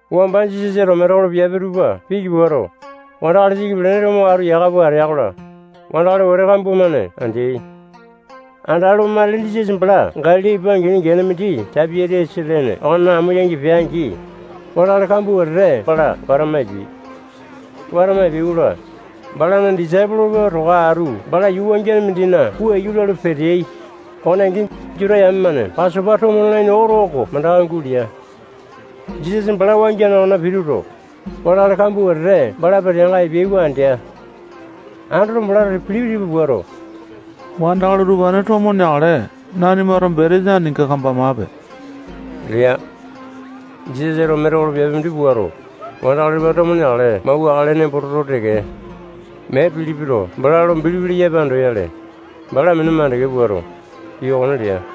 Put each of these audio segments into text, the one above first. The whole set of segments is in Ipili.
Wamba Jisasato metekolo piape tupa piki puato, wandakali siki pelene tupa mo atu yaka pua atea-kola, wandakali wete kambua-mane andeai. Andalu, matili Jisasa bala Galili ipa angini gene mindi Taipi-tiasa lene okona amo yangi pea-angi, wandakali kambua wetete bala watama epeai. Watama epeai-kola, balana disaipolo tupa towa atu bala yuu wangiane mindina puu iyu lalu, peteai. Okone angi, Juta yame-mane Pasopa tomo nalaini oto oko mandaka gulea. Jisasa bala wangiane okonena pituto, wandakali kambua wetete bala peteanga epeyai oko andea. Andoto, balato Pilipi tipa puato, wandakali utupane tomo neakale nanimato betesa aninga kambamape lea. Jisasato metekolo piape mindi puato, wandakali utupane tomo neakale mauwakale nembo toto teke, mee Pilipito bala lo bilipi leyape lo andoyale, bala minu makande puato, pii okone lea.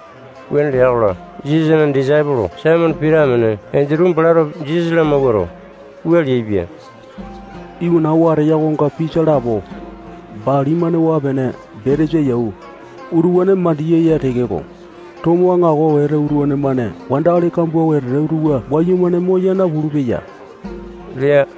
Wuane lea-kola, Jisasana disaipolo Saimone Pita amene Endutu balato Jisasa lamawuato, wua leaipia: Iwana oo ateya okonga pisa lapo, bali-mane waa-pene betesa yau, utupane mandiya ya tekeko, tomo aŋako wete utupane-mane wandakali kambua wetete utupa wayumane moya napulu-peya lea.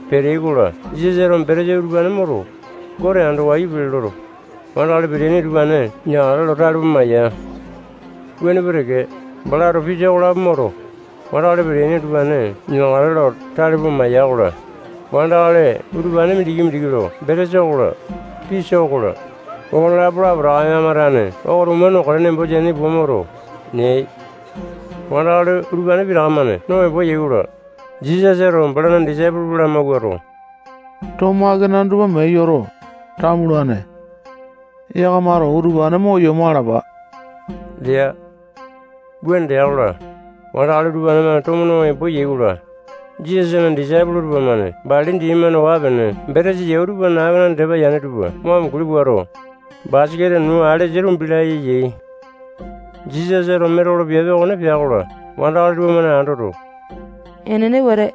Peteai-kola, Jisasato betesa utupane moto, Gote ando wayu pele loto, wandakali peteaini utupane neakale lo tale pua maya. Wuane pua teke, balato pisa okolapo moto, wandakali peteaini utupane neakale lo tale pua maiya-kola, wandakali utupane mindiki-mindiki lo betesa okola, pisa okola, okonelapo lapotaka yakama tane okotuma nokale nembo teaini pua moto, neai. Wandakali utupane pitaka-mane no embo yai-kola, Jisasato balana disaipolo tupa lamawuato, tomo akanane tupa mee yoto, tamulane. Yakamato utupane mo yomo alapa lea. Wuane lea-kola, wandakali utupane-mane tomo no embo yai-kola, Jisasana disaipolo tupamane bali dini-mane waa-pene betesa yau tupana akenane yane tupa mo amunguli puato, basaketa nuu alesa tumbi laya yai. Jisasato metekolo piape okone pea-kola, wandakali tupamane andoto, enene wete,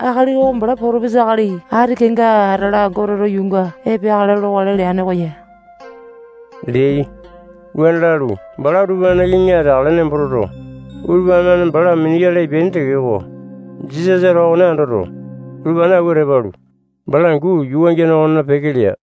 akali oko bala potopesa akali ati kenga atala Goteto yuunga epeakale lokale leane oko ya leai. Wuane lalu, bala utupanena kiŋi ateakale nembo toto, utupane-mane bala minuyale epeaini tekeko, Jisasato okone andoto, utupane awua tepa alu, bala angu yuu wangiane okonena peke lea.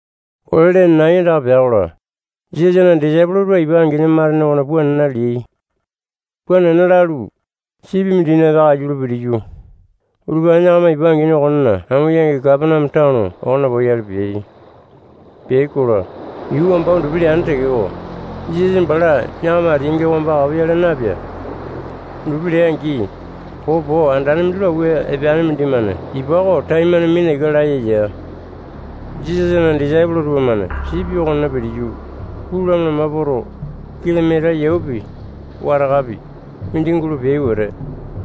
Ole lene nai andaka pea-kola, Jisasana disaipolo tupa ipa angini matene okona puu nena leai. Puu nena lalu, sipi mindina peakaiyu lo pitiyu, utupane yakama ipa angini okonena amo yangi Kapaneame tano okona poyale peai. Peai-kola, yuu wamba undupi leane tekeko, Jisasa bala yakama ateainga wamba kapoyale na-epea. Undupi lea-angi, popo andane mindi lo awua epeane mindimane ipa oko taimane mina ika laya ya. Jisasana disaipolo tupamane sipi okonena pitiyu, pulu lama-lama poto, kilomita yaupi, watakapi, mindi gulo peai wete,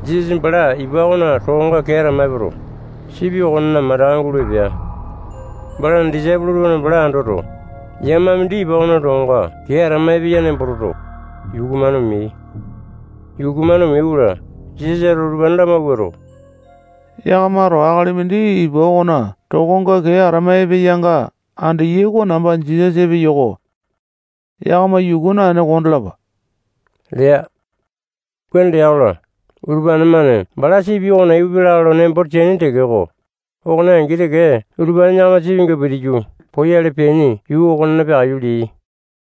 Jisasa bala ipa okona tokonga kee atama epoto, sipi okonena mandaka gulo epea. Balana disaipolo tupamane bala andoto, yama mindi ipa okona tokonga kee atama epeya nembo toto, yuku-mane omeai. Yuku-mane omeai-kola, Jisasato utupane lamawuato, akali mindi ipa okona tokonga kee atama epeyanga yakamato andeyai oko namba Jisasa epeyo-ko. Yakama yuku naene kondalape lea. Wuane lea-kola, utupane-mane bala sipi okona ipupia lakae lo nembo teaini tekeko, okone angi teke utupane yakama sipinga pitiyu poyale peaini yuu okonena peakaiyu leai.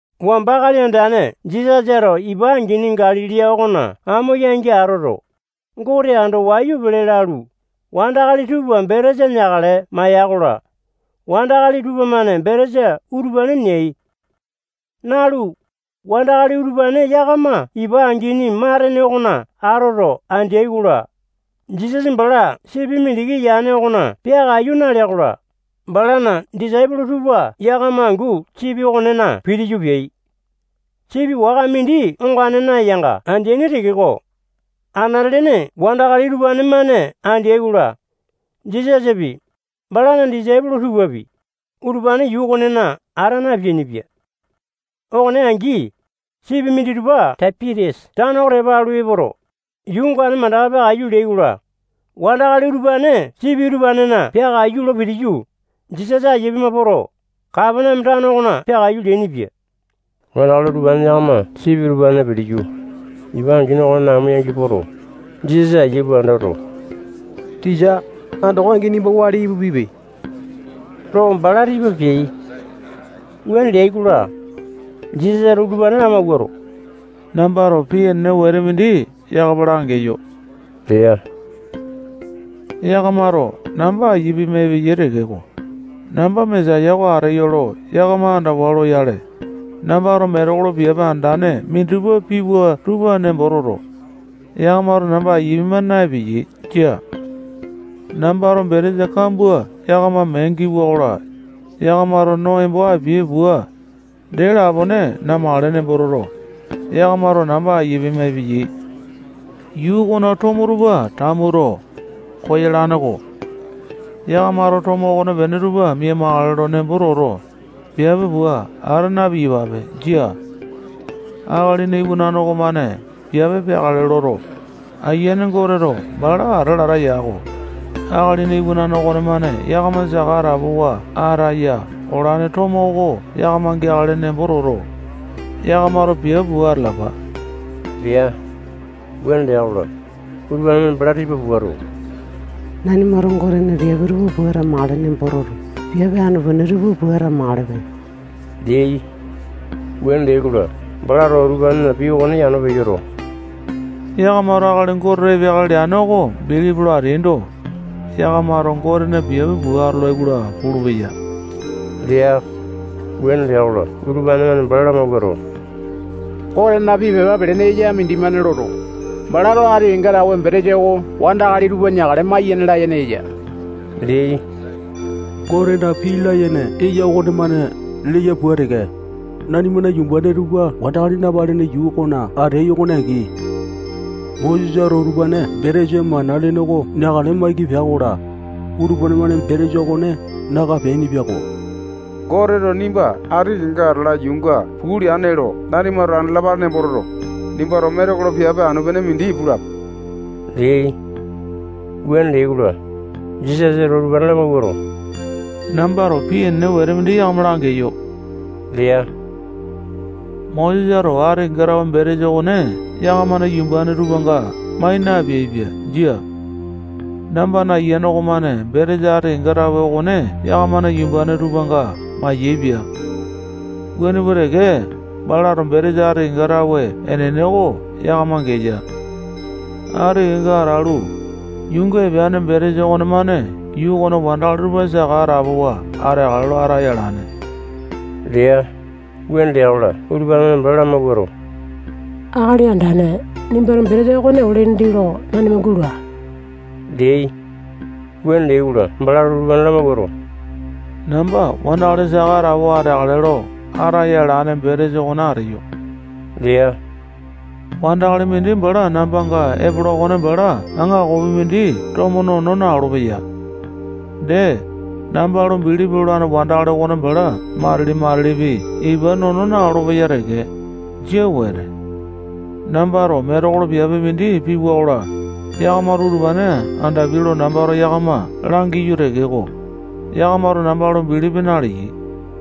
Wamba Akali Andane Jisasato ipa angini Galili okona amo yangi atoto, Gote ando wayu pele lalu, wandakali tupa betesa neakale maiya-kola, wandakali tupamane betesa utupane neai. Nalu, wandakali utupane yakama ipa angini matene okona atoto andeai-kola, Jisasa bala sipi mindiki yane okona peakaiyu nalea-kola, balana disaipolo tupa yakama angu sipi okonena pitiyu, peai. Sipi waka mindi ongane nayanga andeaini tekeko, anate-lene wandakali utupane-mane andeai-kola, Jisasapi, balana disaipolo tupapi, utupane yuu okonena ata napeainipia. Okone angi, sipi minditupa Taipi-tiasa tano oko tepa alu epoto, yuu ongane mandaka peakaiyu leai-kola, wandakali utupane sipi utupanena peakaiyu lo pitiyu, Jisasa aiya pima poto, Kapaneame tano okona peakaiyu leainipia. Wandakali utupane yakama sipi utupanena pitiyu, ipa angini okonena amo yangi poto, Jisasa aiya pua andoto, tisa, andoko angi nimba wali ipupipe lo bala tipa peai. Wuane leai-kola, Jisasato utupane lamawuato, nambato pii enene wete mindi yakama langeyo lea. Yakamato namba aiya pima epeyai tekeko, namba Mesaya oko ateyo lo yakama andawa loyale, nambato metekolo piape andane minditupa piwa tupa nembo toto, yakamato namba aiya pima naepeyei. Jia. Nambato betesa kambua yakama mee giwa-kola, yakamato no embo apiai pua, dee lapone namakale nembo toto, yakamato namba aiya pima epeyai. Yuu okona tomo tupa tamuto, koyalane-ko. Yakamato tomo okonepene tupa mia-makale nembo toto, piape pua ata na-piyapa. Jia. Akalina Iwanane okomane piape peakale loto, Ayiane Goteto bala ata lata yako. Akalina Iwanane okonemane yakama saka atapowa ataya olane tomo oko yakama geakale nembo toto, yakamato piape pua atalapa lea. Wuane lea-kola, utupane-mane bala tipa puato, nanimato Gotena piape tupa pua atamakale nembo toto, piape anu-pene tupa pua atamakalepe leai. Wuane leai-kola, balato utupanena pii okone yano peyoto, yakamato akali Goteto epeakale leane oko bilipi lo ateaindo, yakamato Gotena piape pua atolai-kola pulupeya lea. Wuane lea-kola, utupane-mane bala lamawuato, Gotena pii pepa pelene eya mindimane loto, balato ati kenga tawe betesa oko wandakali tupa neakale maiyane layene eya leai. Gotena pii layene eya okonemane leya pua teke, nanimana yumbane tupa wandakali napalene yuu okona ateai okone angi, Mosesato utupane betesa mana lene oko neakale maiki pea-kola, utupane-mane betesa okone naka peainipia-ko. Goteto nimba ati kenga atala yuunga puu leane lo nanimato andalapale nembo toto, nimbato metekolo piape anu-pene mindi pulape leai. Wuane leai-kola, Jisasato utupane lamawuato, nambato pii enene wete mindi yakama langeyo lea. Mosesato ati kenga tawe betesa okone yakamana yumbane tupanga mai napeaipia. Jia. Nambana Ayiane okomane betesa ati kenga tawe okone yakamana yumbane tupanga mayaepia. Wuane pua teke, balato betesa ati kenga tawe enene oko yakama geya. Ati kenga atalu, yuunga epeane betesa okonemane yuu okona wandakali tupa saka atapowa ateakale lo ataya alane lea. Wuane lea-kola, utupane-mane bala lamawuato, Akali Andane, nimbato betesa okone ole dindi lo nanima gula leai. Wuane leai-kola, balato utupane lamawuato, namba wandakali saka atapowa ateakale lo ataya alane betesa okone ateyo lea. Wandakali mindi bala nambanga epola okone bala aŋakopi mindi tomo nono na-olopeya. Dee, namba lo bilipi lolane wandakali okone bala matili-matilipi ipa nono na-olopeya teke. Jia wete. Nambato metekolo piape mindi piwa-kola, yakamato utupane andapiai lo nambato yakama langiyo tekeko, yakamato namba lo bilipi naleyai.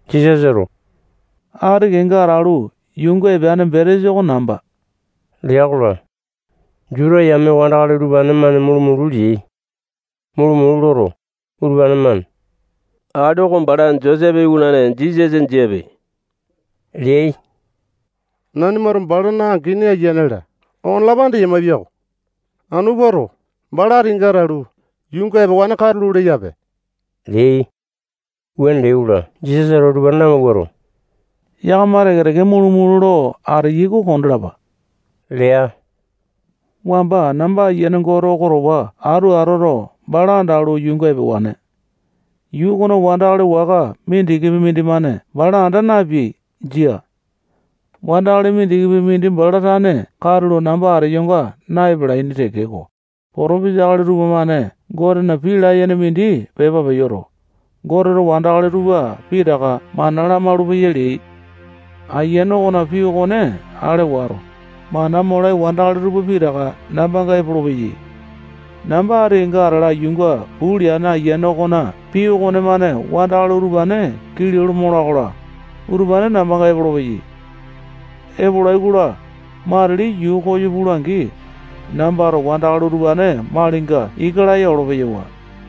Jisasato ati kenga atalu, yuunga epeane betesa oko namba lea-kola, Juta yame wandakali utupane-mane mulu-mulu leai. Mulu-mulu loto, utupane-mane akali oko bala Josepe iwanane Jisasa jiape leai. Nanimato balana angini, ayiane-la, okonelapo andeyamae piako. Anu puato, bala ati kenga atalu, yuunga epewane katulo leyape leai. Wuane leai-kola, Jisasato utupane lamawuato, yakama teke-teke mulu-mulu lo ateyai oko kondalapa lea. Wamba namba Ayiane Gote oko towa atu atoto, bala andalu, yuunga epewane. Yuu okona wandakali waka mindikipi mindimane bala anda napeai. Jia. Wandakali mindikipi mindi bala tane katulo namba ateyonga na-epalaini tekeko, potopisa akali tupamane Gotena pii layene mindi pepa peyoto, Goteto wandakali tupa pitaka mana lamaulu-peya leai. Ayiane okona pii okone ale wato, mana molai wandakali tupa pitaka nambanga epolopeyai. Namba ati kenga atala yuunga puu leane Ayiane okona pii okonemane wandakali utupane kilau lo mola-kola, utupane nambanga epolopeyai. Epolai-kola, matili yuu koyo pula-angi, nambato wandakali utupane malinga ika laya olo-peyawa.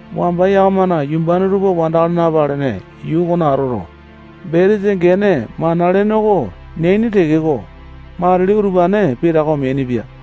Wamba yakamana yumbane tupa wandakali napalene yuu okona atoto, betesa gene mana lene oko neaini tekeko, matili utupane pitaka omeainipia.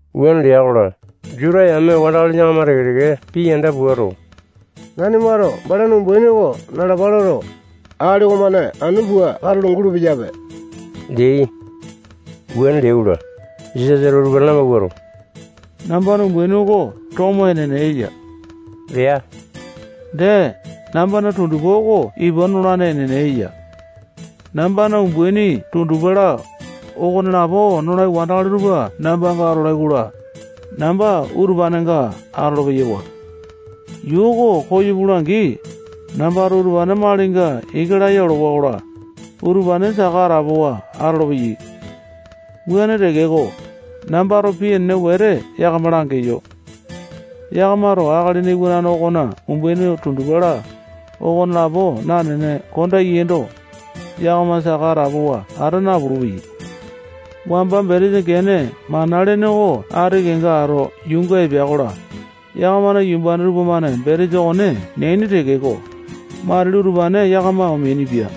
Wuane lea-kola, Juta yame wandakali yakama teke-teke pii yanda puato, nanimato balana umbaini oko nalapa loto, akali okomane anu pua katulo gulupeyape leai. Wuane leai-kola, Jisasato utupane lamawuato, nambana umbaini oko tomo enene eya lea. Dee, nambana tundupa oko ipa nolane enene eya. Nambana umbaini tundupa-la, okonelapo nolai wandakali tupa nambanga atolai-kola, namba utupanenga atolo-peyawa. Yuu oko koyo pula-angi, nambato utupane malinga ika laya olowa-kola, utupane saka atapowa atolopeyai. Wuane tekeko, nambato pii enene wete yakama langeyo. Yakamato Akalina Iwanane okona umbaini tundupa-la, okonelapo nanene kondeaindo, yakama saka atapowa ata napulu-peyai. Wamba betesa gene mana lene oko ati kenga ato yuunga epea-kola, yakamana yumbane tupamane betesa okone neaini tekeko, matili utupane yakama omeainipia.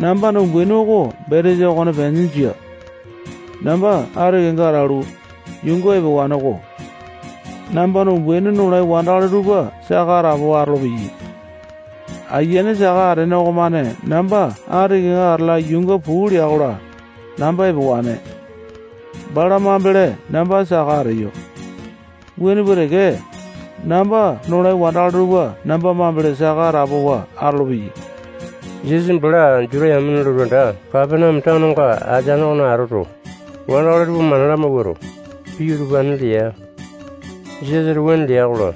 Nambana umbaini oko betesa okonepene jia. Namba ati kenga atalu, yuunga epewane-ko. Nambana umbaini nolai wandakali tupa saka atapowa atolopeyai. Ayiane saka atene okomane namba ati kenga atala yuunga puu lea-kola, namba epewane. Bala mambele namba saka ateyo. Wuane pua teke, namba nolai wandakali tupa namba mambele saka atapowa atolopeyai. Jisasa bala Juta yamena lotu anda Kapaneame tanonga ateane okona atoto, wandakali tupa mana lamawuato, pii utupane lea. Jisasato wuane lea-kola,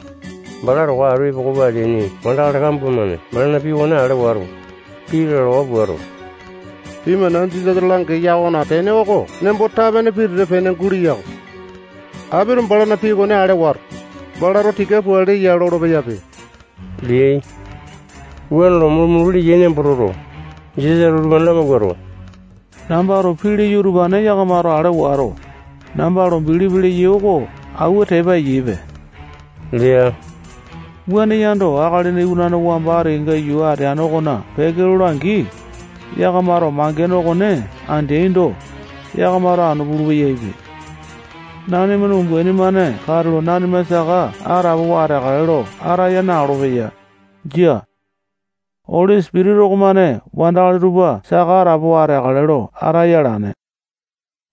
bala towa atu epoko pua ateaini wandakali kambua-mane balana pii okone ale wato, pii lalawa puato, pii mana Jisasato langeya okona tene oko nembo tape-pene pitete-pene guleya-ko. Apito balana pii okone ale wato, balato tika pua leya lolo-peyape leai. Wuane lo mulu-mulu leyai nembo toto, Jisasato utupane lamawuato, nambato pii leyo utupane yakamato ale wato, namba lo bilipi leyai oko awua tepa eyaipe lea. Wuane yando, Akalina Iwanane wamba ati kenga yuu ateane okona peke lola-angi, yakamato mangene okone andeaindo, yakamato anu pulu-peyaipe. Nanimana umbaini-mane katulo nanima saka atapowa ateakale lo ataya na-olopeya. Jia. Oli Sipitisa okomane wandakali tupa saka atapowa ateakale lo ataya alane.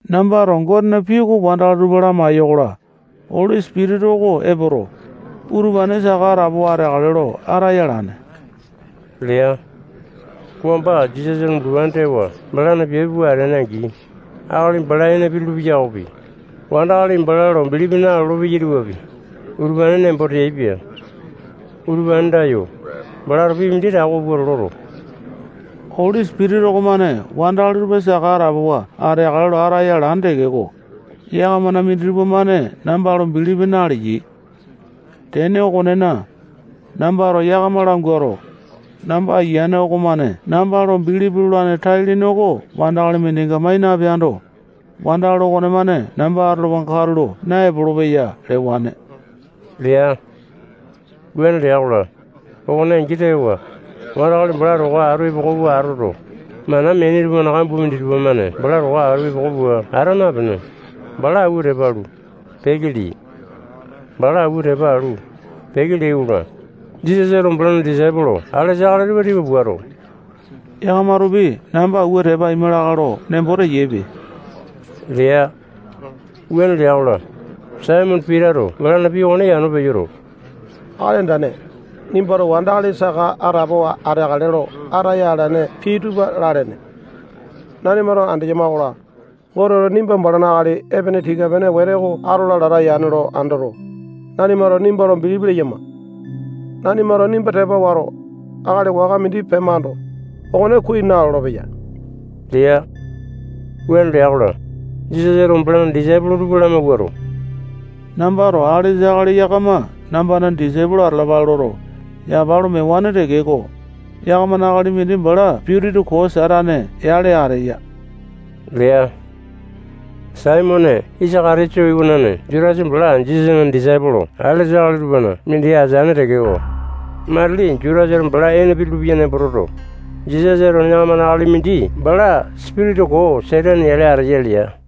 Nambato Gotena pii oko wandakali tupa lamai-yokola, Oli Sipitisa oko epoto, utupane saka atapowa ateakale lo ataya alane lea. Wamba Jisasato bulupane tewa balana piape pua atea-angi, akali bala ene pitulu-peya okopi, wandakali bala lo bilipi nalolo-peyai tupapi, utupane nembo teaipia. Utupane andayo, balato pii mindi tako pua loto, Oli Sipitisa okomane wandakali tupa saka atapowa ateakale lo ataya alane tekeko, yakamana minditupa-mane namba lo bilipi naleyai. Tene okonena, nambato yakama languato, namba Ayiane okomane namba lo bilipi lolane tai-lene oko wandakali mindinga mai napeando, wandakali okonemane namba atolowanga katulo naepolo-peya lewane lea. Wuane lea-kola, okone angi tewa, wandakali bala towa atu epoko pua atoto, mana meaini tupana kambua minditupa-mane bala towa atu epoko pua ata napene, bala awua tepa alu, peke leai. Bala awua tepa alu, peke leai-kola, Jisasato balana disaipolo alesa akali tupa tipa puato, yakamatopi namba awua tepa aima lakae lo nembo teyaipe lea. Wuane lea-kola, Saimone Pitato balana pii okone yano peyoto, Akali Andane, nimbato wandakali saka atapowa ateakale lo ataya alane pii tupa lalene. Nanimato andeyama-kola, Goteto nimba balana akali epene tika-pene wete oko atola lata yane lo andoto, nanimato nimba lo bilipi leyama. Nanimato nimba tepa wato, akali waka mindi pemando, okone kuai nalolo-peya lea. Wuane lea-kola, Jisasato balana disaipolo tupa lamawuato, nambato alesa akali yakama nambana disaipolo tupa atalapale loto, yapa lo mewane tekeko, yakamana akali mindi bala sipitisa koo Satane yale ateya lea. Saimone Isaka-tiyote iwanane Jutasa bala Jisasana disaipolo alesa akali tupana mindi ateane tekeko, matili Jutasato bala ene pitulu-peya nembo toto, Jisasato yakamana akali mindi bala sipitisa koo Satane yale ateya lea.